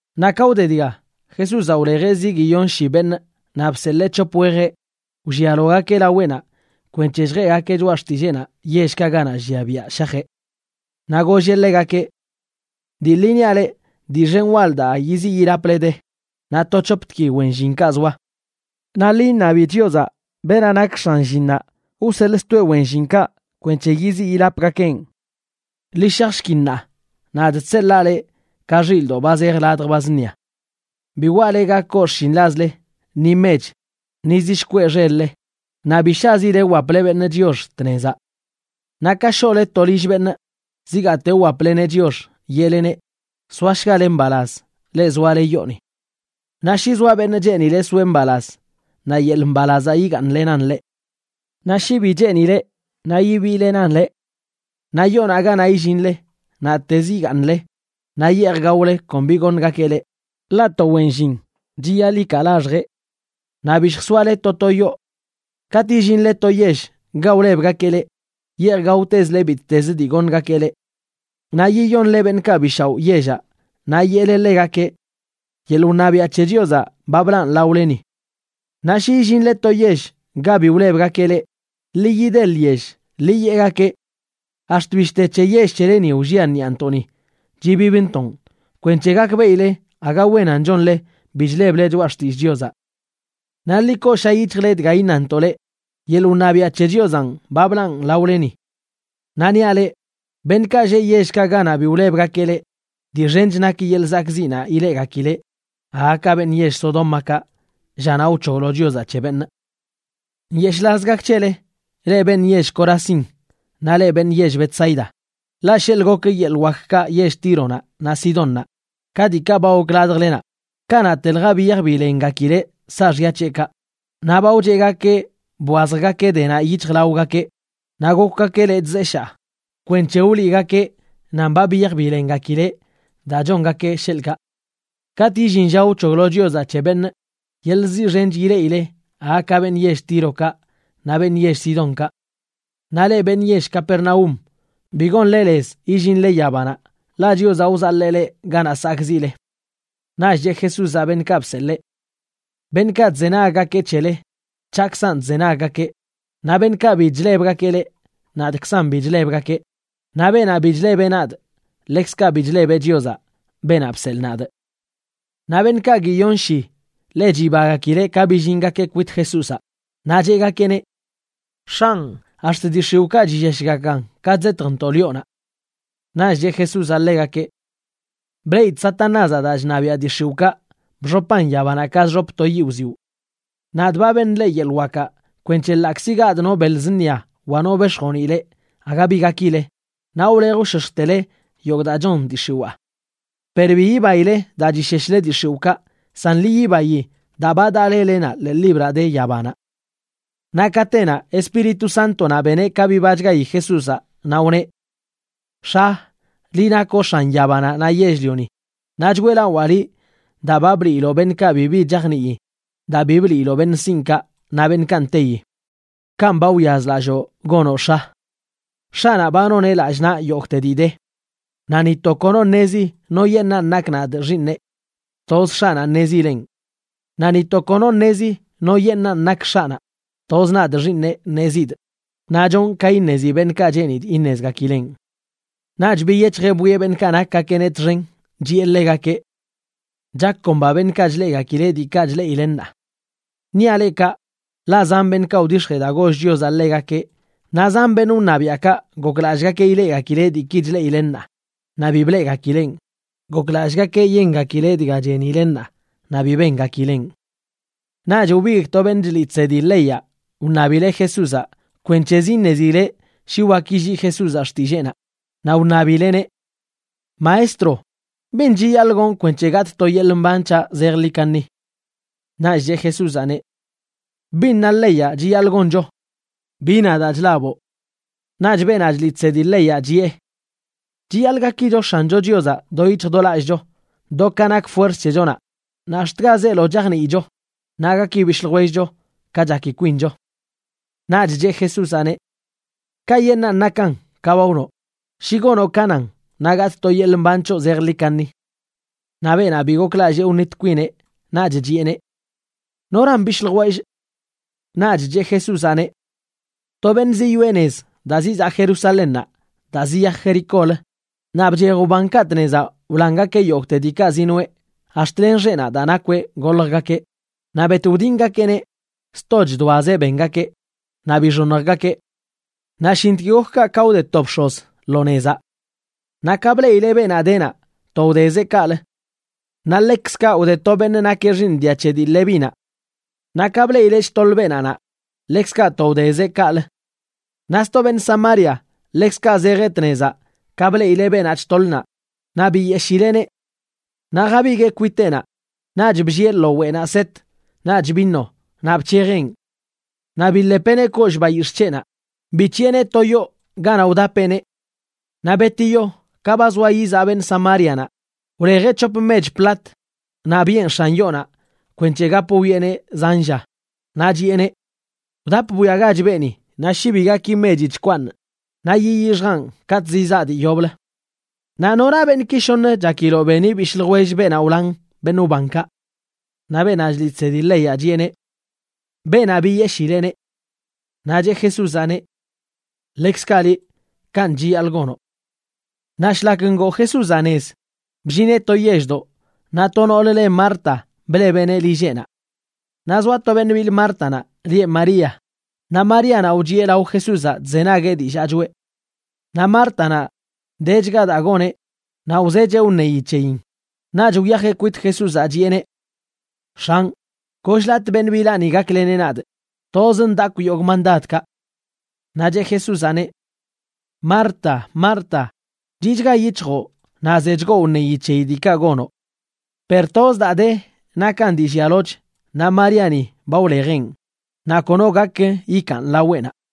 Naꞌ ka wde dga, Jesúzaꞌ wlejeꞌ zi guiyon shi beṉꞌa naꞌ bseḻee c̱hop wejeꞌ wllialogakeꞌ laweꞌnaꞌ kwenc̱he lljeꞌgakeꞌ choꞌa xtilleenaꞌ yellkaꞌ ganaꞌ llia biaꞌ shajeꞌ. Naꞌ golleꞌ ḻegakeꞌ: ―Dii ḻi niaꞌ leꞌ, dii xen wal daa yiziꞌ yilaple de, naꞌ to c̱hoptgui wen llinkaꞌ zoa. Naꞌ ḻi iṉabi Chiozaꞌ, beenaꞌ nak x̱an llinnaꞌ wseḻꞌstoeꞌ wen llinkaꞌ kwenc̱he yiziꞌ yilapgakeꞌn. Ḻi shajshki ṉaa, nadꞌ chseḻaa leꞌ ka xilꞌdoꞌ ba zej ladj ba zṉia. Bi waꞌle ga koo xshinḻazle, ni mech, ni zi shkweꞌ xel-le; naꞌ bi shazile wwaple beṉꞌ chiox tnezaꞌ. Naꞌ ka shoꞌle to lill beṉꞌ, zigaate wwapleneꞌ chiox, yeꞌleneꞌ: “Soashgale mbalaz, leꞌ zoale yooni.” Naꞌ shi zoa beṉꞌ cheenileꞌ soeꞌ mbalaz, naꞌ yeḻꞌ mbalazaꞌ yigaaṉlenan ḻeꞌ. Naꞌ shi bi cheenileꞌ, naꞌ yibiilenan leꞌ. Naꞌ yoonaꞌ ganaꞌ illinle naꞌtezə yigaaṉle naꞌ yeej gaole kon bi goṉgakeꞌ leꞌ, ḻaꞌ to wen llin chiyaḻꞌ ikaa laxjeꞌ. Naꞌ bi lljsoale to to yoo. Katꞌ illinle to yell ga wlebgakeꞌ leꞌ, yeej gaotezle bittezə dii goṉgakeꞌ leꞌ. Naꞌ yiyonle beṉꞌkaꞌ bi shaoꞌ yellaꞌ, naꞌ yeꞌle ḻegakeꞌ: “Yeḻꞌ wṉabiaꞌ c̱he Chiozaꞌ ba blaꞌn laoleni.” Naꞌ shi illinle to yell ga bi wlebgakeꞌ leꞌ, ḻi yide lyell, ḻi yeꞌgakeꞌ: “Ax̱t bishte c̱he yell c̱heleni wllia ṉiꞌantoꞌni chibibntoꞌn kwenc̱he gakbeꞌile aga wenan chonle bi chleble choꞌa xtillꞌ Chiozaꞌ. Naꞌ ḻi koosha yic̱hjle dga iṉantoꞌ leꞌ, yeḻꞌ wṉabiaꞌ c̱he Chiozaꞌn ba blaꞌn laoleni.” Naꞌ niaꞌ leꞌ, beṉꞌkaꞌ lleꞌ yellkaꞌ ganaꞌ bi wlebgakeꞌ leꞌ, dii xench nak yeḻꞌ zakꞌziꞌnaꞌ ileꞌgakileꞌ aga ka beṉꞌ yell Sodómakaꞌ llanaꞌ wc̱hoglo Chiozaꞌ c̱he beṉꞌ. ’¡Nyeshꞌlaz gak c̱hele, leꞌ beṉꞌ yell Corazín naꞌ leꞌ beṉꞌ yell Betsaida! Ḻaꞌ sheḻꞌ gok yeḻꞌ wakkaꞌ yell Tíronaꞌ naꞌ Sidónnaꞌ ka diikaꞌ ba gok ladjlenaꞌ, kanaꞌtelja biyaj bilengakileꞌ saaxya c̱heꞌkaꞌ, naꞌ ba wcheꞌgakeꞌ bwazjgakeꞌ denaꞌ yic̱hjlaogakeꞌ naꞌ gokwgakeꞌ lechꞌ zeshaa, kwenc̱he wliꞌgakeꞌ nan ba biyaj bilengakileꞌ daa chongakeꞌ, sheḻꞌkaꞌ. Katꞌ illin lla wc̱hoglo Chiozaꞌ c̱he beṉꞌ, yeḻꞌ ziꞌ xench ileꞌile aga ka beṉꞌ yell Tírokaꞌ naꞌ beṉꞌ yell Sidonkaꞌ. Naꞌ leꞌ beṉꞌ yell Capernaúm, bi gonle lez yillinle yabanaꞌ, ḻaꞌ Chiozaꞌ wzaḻee leꞌ ganaꞌ sakꞌziꞌle. Naꞌch cheꞌ Jesúzaꞌ beṉꞌkaꞌ bseḻee: ―Beṉꞌkaꞌ chzenaggakeꞌ c̱hele, c̱haꞌkzan chzenaggakeꞌ. Naꞌ beṉꞌkaꞌ bi chlebgakeꞌ leꞌ, nadꞌkzan bi chlebgakeꞌ. Naꞌ beenaꞌ bi chlebeꞌ nadꞌ, ḻekzkaꞌ bi chlebeꞌ Chiozaꞌ, beenaꞌ bseḻꞌ nadꞌ. Naꞌ beṉꞌkaꞌ guiyon shib ḻe chibagakileꞌ ka billingakeꞌ kwit Jesúzaꞌ, naꞌ cheꞌgakeꞌneꞌ: ―X̱anꞌ, ax̱t dii x̱iwꞌkaꞌ chilleshgakan ka chzetjntoꞌ lioꞌnaꞌ. Naꞌch cheꞌ Jesúzaꞌ ḻegakeꞌ: ―Bleꞌidꞌ Satanázaꞌ daa chṉabiaꞌ dii x̱iwꞌkaꞌ bxopan yabanaꞌ ka chxop to yiꞌ wziwꞌ. Nadꞌ ba beṉꞌ leꞌ yeḻꞌ wakaꞌ kwenc̱he ḻaꞌkzi gadꞌ no beḻ zṉia wa no bex̱joniꞌ leꞌ aga bi gakileꞌ, naꞌ wlej wshoshjtele yogꞌ daa chon dii x̱iwaa. Per bi yibaile daa chisheshle dii x̱iwꞌkaꞌ, san ḻi yibayi daa ba daꞌ lelenaꞌ ḻee libraꞌ de yabanaꞌ. Naꞌ katenaꞌ Espíritu Sántonaꞌ beneꞌ ka bibachgayi Jesúzaꞌ, naꞌ wneꞌ: ― X̱a, liꞌ nakoꞌ X̱an yabanaꞌ naꞌ yell-lioni, naꞌ choeꞌlawaa liꞌ daa ba bliiloꞌ beṉꞌkaꞌ bibi chajnii daa bi bliiloꞌ beṉꞌ sinꞌkaꞌ naꞌ beṉꞌkaꞌ nteyi. Kanꞌ ba wyazlalloo gonoꞌ, X̱a. ’X̱aꞌnaꞌ ba noneꞌ lallꞌ naꞌ yogꞌte dii de. Naꞌ ni to kono ṉezi noyeṉꞌanꞌ nakꞌ nadꞌ Xiiṉeꞌ; toz X̱aꞌnaꞌ ṉezileꞌn. Naꞌ ni to kono ṉezi noyeṉꞌanꞌ nak X̱aꞌnaꞌ; toz nadꞌ Xiiṉeꞌ ṉezidꞌ, naꞌ chonꞌ ka iṉezi beṉꞌkaꞌ cheenidꞌ iṉezgakileꞌn. Naꞌch biyec̱hjeꞌ bwieꞌ beṉꞌkaꞌ nakgakeꞌneꞌ txen, chiꞌe ḻegakeꞌ: ―Chakomba beṉꞌkaꞌ chleꞌgakileꞌ diikaꞌ chleꞌile ṉaa. Niaꞌ leꞌ kaꞌ, ḻaꞌ zan beṉꞌkaꞌ wdix̱jee daa goll Chiozaꞌ ḻegakeꞌ naꞌ zan beṉꞌ wṉabiaꞌkaꞌ goklallꞌgakeꞌ ileꞌgakileꞌ diiki chleꞌile ṉaa, naꞌ bi bleꞌgakileꞌn. Goklallꞌgakeꞌ yengakileꞌ dga chenile ṉaa, naꞌ bi bengakileꞌn. Naꞌch wbigꞌ to beṉꞌ chliꞌ chsedi leyaꞌ wṉabileꞌ Jesúzaꞌ kwenc̱hezə iṉezileꞌ shi wak yillii Jesúzaꞌ xtilleenaꞌ, naꞌ wṉabileꞌneꞌ: ―Maestro, ¿bin chiyaḻꞌ gonꞌ kwenc̱he gatꞌ to yeḻꞌ mban c̱haꞌ zejḻi kaṉi? Naꞌch cheꞌ Jesúzaꞌneꞌ: ―¿Bin na leyaꞌ chiyaḻꞌ goncho? ¿Bi na daa chlaboꞌ? Naꞌch beenaꞌ chliꞌ chsedi leyaꞌ chiꞌe: ―“Chiyaḻꞌ gakicho X̱ancho Chiozaꞌ do yic̱hj do lallꞌcho, do ka nak fuerz c̱hechonaꞌ, naꞌ ax̱t ga zeelo chajniicho; naꞌ gaki bishꞌ ljwellcho ka chaki kwincho.” Naꞌch cheꞌ Jesúzaꞌneꞌ: ―Kayeṉꞌnan nakan ka ba wnoꞌ. Shi gonoꞌ ka nan, naꞌ gatꞌ to yeḻꞌ mban c̱hoꞌ zejḻi kaṉi. Naꞌ beenaꞌ bi goklallꞌ wṉit kwineꞌ, naꞌch chiꞌeneꞌ: ―¿Noran bishꞌ ljwellꞌ? Naꞌch cheꞌ Jesúzaꞌneꞌ: ―To beṉꞌ ziyoꞌe nez daa zizaꞌ Jerusalénnaꞌ daa ziyaj Jericólə, naꞌ bchej wbankaꞌ tnezaꞌ wlangakeꞌ yogꞌte diikaꞌ zinoꞌe ax̱t len xeꞌnaꞌ daa nakweꞌ goljgakeꞌ, naꞌ bet wdingakeꞌneꞌ, sto chdoazeꞌ bengakeꞌ, naꞌ bixoṉjgakeꞌ. Naꞌ shintk gok kaꞌ ka wde to bx̱oz lo nezaꞌ. Naꞌ ka bleꞌileꞌ beenaꞌ de naꞌ, to wdezeꞌ kaꞌlə. Naꞌ ḻekzkaꞌ wde to beṉꞌ nakeꞌ xiiṉ dia c̱he dii Levínaꞌ. Naꞌ ka bleꞌileꞌ chtoḻ beenaꞌ naꞌ, ḻekzkaꞌ to wdezeꞌ kaꞌlə. Naꞌ sto beṉꞌ Samaria ḻekzkaꞌ zejeꞌ tnezaꞌ ka bleꞌileꞌ beenaꞌ chtoḻ naꞌ, naꞌ biyeshileꞌneꞌ. Naꞌ jabiguee kwiteꞌnaꞌ, naꞌch bllieꞌ lo weꞌnaꞌ set naꞌch vino, naꞌ bc̱hejeꞌn. Naꞌ biḻepeꞌneꞌ kollꞌ bayix̱ꞌ c̱heꞌnaꞌ, bic̱hiꞌeneꞌ to yoo ganaꞌ wdapeꞌneꞌ. Naꞌ betiyo, ka ba zoa yizaꞌ beṉꞌ Samárianaꞌ, wlejeꞌ c̱hop mech platc, naꞌ biꞌen x̱an yoonaꞌ kwenc̱he gap wwieꞌneꞌ zan lla, naꞌ chiꞌeneꞌ: “Wdap bwiagach beeni, naꞌ shi bi gaki mechi chkwaaṉꞌ, naꞌ yiyixjaꞌn katꞌ zizaa dii yoblə.” Naꞌ ¿nora beṉꞌki shoṉ chakiloꞌ beni bishꞌ ljwell beenaꞌ wlan beṉꞌ wbankaꞌ? Naꞌ beenaꞌ chliꞌ chsedi leyaꞌ chiꞌeneꞌ: ―Beenaꞌ biyeshileꞌneꞌ. Naꞌ cheꞌ Jesúzaꞌneꞌ: ―Ḻekzkaꞌ liꞌ, kanꞌ chiyaḻꞌ gonoꞌ. Naꞌ shlak ngoo Jesúzaꞌ nez, bllineꞌ to yelldoꞌ naꞌ to noolə le Marta blebeꞌneꞌ lilleꞌnaꞌ. Naꞌ zoa to beṉꞌ bil Mártanaꞌ lieꞌ María, naꞌ Maríanaꞌ wchiꞌe lao Jesúzaꞌ chzenagueꞌ dillaa choꞌe. Naꞌ Mártanaꞌ, dechga daa goneꞌ naꞌ wzecheꞌ wṉeyi c̱heyin, naꞌch wyajeꞌ kwit Jesúzaꞌ, chiꞌeneꞌ: ―X̱anꞌ, goll-latꞌ beṉꞌ bilaꞌni gakleneꞌ nadꞌ. Tozꞌ ndakwꞌ yogꞌ mandadkaꞌ. Naꞌ cheꞌ Jesúzaꞌneꞌ: ―Marta, Marta, chiꞌchga yic̱hjoꞌ naꞌ zechgoꞌ wneyi c̱heyi diikaꞌ gonoꞌ. Per toz daa de nakan dii llialoch naꞌ Maríani ba wlejeꞌn, naꞌ kono gak yikaan laweꞌnaꞌ.